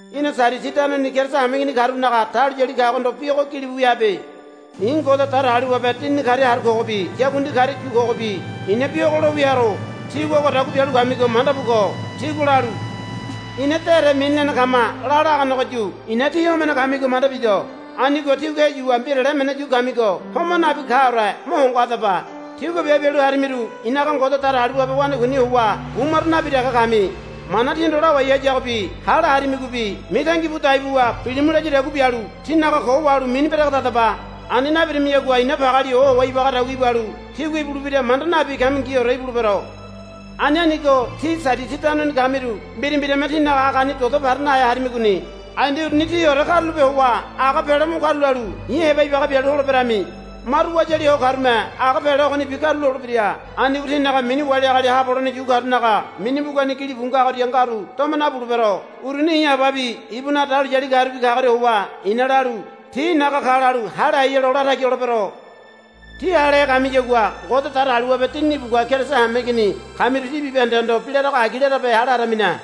Í̠na Sadisi tanoni Keriso hameigini karunaga dahuliyali kagohondo bi ogo gilibu wia habe. I̱ Ngode Datagaliwabe Dinini karia haru kogobi yakundi karia yu kogobi i̱na bi ogo lo wia haro. Tígua ogodagua bialu kamigo manda bu ko. Tígua lalu, Ina dére mini lene kama, la laganegoyu i̱na tí homene kamigo manda bido. Anigo tígua heyuwa mbirale emene yu kamigo homai nakaore mo hongo hadaba. Tígua biabe bialu harimiru i̱naga Ngode Datagaliwabe wanakuini howa bu maro nabi dege kami. Mana tíhondo lawai hayagobi hale harimigobi mitangi bu dai buwa, Bilimu, layadagua bialu tínaga ko wahalu mini beregedadaba. Ani nabirimiyagua i̱na pageali ohowa ibagadagua ibalu tígua ibulebira manda nabi kamingiore ibulebero. Ani anigo tí Sadisi tanoni kamiru mbira mbirame tínaga agani dodo para nahe harimigoni. Ai nde uruni tíore karulape howa aga pele mo karulalu i̱ heba ibaga bialu holeberami. Maru wayali ho karume aga pele ogonibi karulolebira. Anigo tinaga mini wali agali haabo holene yu karunaga mini mbugani gilibu ngagoria ngaru doma nabulebero. Uruni i̱ Ababi ibunaga dahuliyalirubi kagoria howa i̱na lalu, Ti i̱naga ka, lalu hale hai helo latagi holebero. Tí halehe kamiyagua Ngode Datagaliwabe Dinini ibugua Keriso hameigini kamiru tí bibahendehondo bi larago agi larabe hale haremine.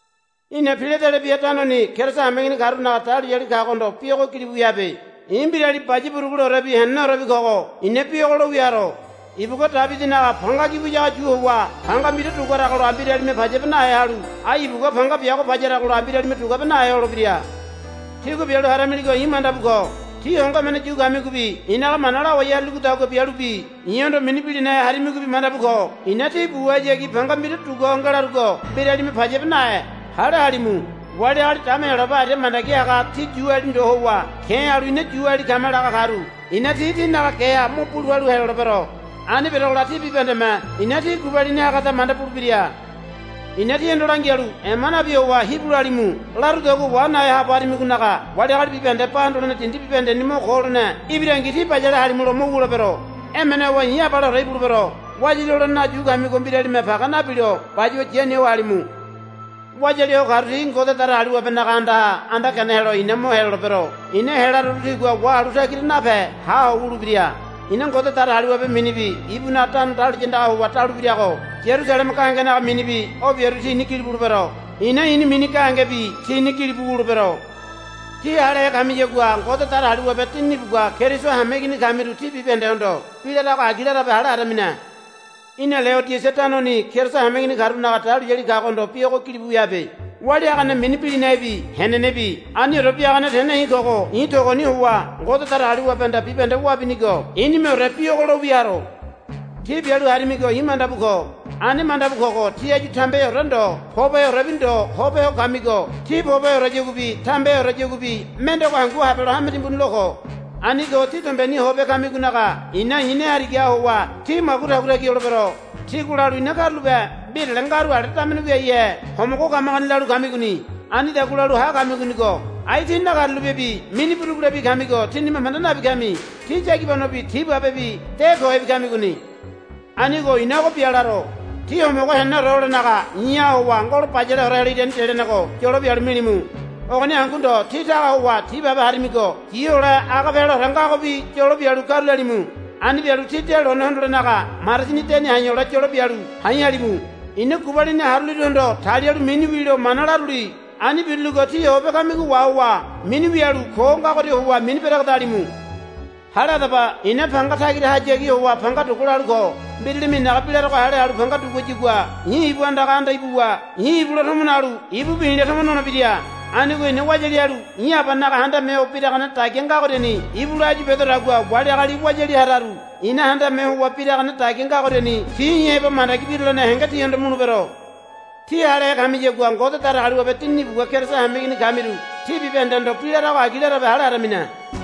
Í̠na Piladelebia tanoni Keriso hameigini karunaga dahuliyali kagohondo bi ogo gilibu wia habe. I̱ mbirali baya buruguleorebi heneneorebi kogo i̱na bi ogo lo wia haro. Ibugua Debidinaga panga gi wiyago yu howa panga mbira duguaragola mbiralime payabe nahe halu ai ibugua panga biago payaragola mbiralime duguabe nahe holebira. Tígua bialu haramiligo i̱ manda bu ko. Tí hongo emene yu kamigobi i̱naga mana lawai haruligodagua bialubi i̱hondo mini bilinahe harimigobi manda bu ko. I̱na tí buhayagi panga mbira dugua ho ngelarugo mbiralime payabe nahe. Hale halimu. Wali agali dama Heyolabe aria mandagi haga ti Yuali ndo howa ke̱ halu, Ina Yuali kama, laga karu i̱na ti tínaga geha mo bulu palu helolebero. Ani berogola ti bibahendeme i̱na tí gubalini hagada manda bulebira. I̱na tíhondo langialu, Ema nabi howa hibu lalimu, larugodagua wa nahe haabo harimigonaga wali agali bibahende ba hondole dindi bibahendeni mo ko holene ibirangi tí bayale halimulo mo wulebero. Emene howa i̱ abaleore ibulebero. Wayali holenenaga yu kamigo mbiralime page nabilo bayuwa yani ho halimu. Wayali ho karu ti Ngode Datagaliwabenaga andaha anda gene helo i̱na mo helolebero. I̱na helaroru tigua wahalu tagira nape ha ho wulebira. I̱na Ngode Datagaliwabe minibi ibunaga tano dahuliya andagaha howa daluebirago Yarusaleme gahengenaga minibi o biaru tini gili bulebero. I̱na i̱ni mini gahenegebi tini gili bu wulebero. Tí halehe kamiyagua Ngode Datagaliwabe Dinini ibugua Keriso hameigini kamiru tí bibahendehondo bi larago agi larabe hale haramine. Í̠na Leodisia tanoni Keriso hameigini karunaga dahuliyali kagohondo bi ogo gilibu wia habe. Walia hagane mini bilinahebi henenebi Aniore Biagane Tene i̱ kogo i̱ togoni howa Ngode Datagaliwabehanda bibahende wabinigo i̱nimeore bi ogo lo wia haro. Tí bialu harimigo i̱ manda bu ko. Ani manda bu kogo tí áyu tambeheore ndo poboheorebi ndo hope ho kamigo tí pobeheoreyaguabi tambeheoreyaguabi mendego hangu habelo hame timbuni lo ko. Anigo tí dombeni hope ho kamigonaga i̱na i̱ ne harigaha howa tí magu tagu tagi holebero. Tígua lalu, Ina karulape mbirale ngaru ale damene wiaihe homogo kamagoni, lalu kamigoni. Anidagua lalu ha kamigonigo ai tí nakarulapebi mini burugulebi kamigo tínime manda nabi kami. Tí yagibanobi tibabebi de kohebi kamigoni. Anigo i̱na ogo bia laro. Tí homogo heneneore holenaga i̱ha howa ngolo bayaleore helo irani delenego yolo bialu milimu. Ogoni hangu ndo tí taga howa tibabe harimigo yi hole aga peleore ngagobi yolo bialu karulalimu. Ani bialu tí de lone hondolenaga marasini deni ha̱i̱ hole yolo bialu ha̱i̱ halimu. I̱na gubalini haruliruhondo talialu mini wilo mana laruli. Ani biruligo tí hope kamigo wahowa mini wialu ko ngagoria howa mini beregedalimu. Hale hadaba. I̱na panga tagirahayagi howa panga dugua lalu ko. Mbiralime i̱naga bi larogo hale halu panga duguayagua i̱ ibu andaga anda ibuwa i̱ ibula tomo nalu ibubi i̱la tomo nolebira. Anigo i̱na wayali halu i̱ Abanaga handame ho biragane dagia ngagoriani ibula áyu bedodagua wali agali wayali hararu i̱na handame howa biragane dagia ngogoriani ti i̱ heba mandagi birulene henge tihondo mulebero. Tí halehe kamiyagua Ngode Datagaliwabe Dinini ibugua Keriso hameigini kamiru tí bibahendehondo bi larago agi larabe hale haramine.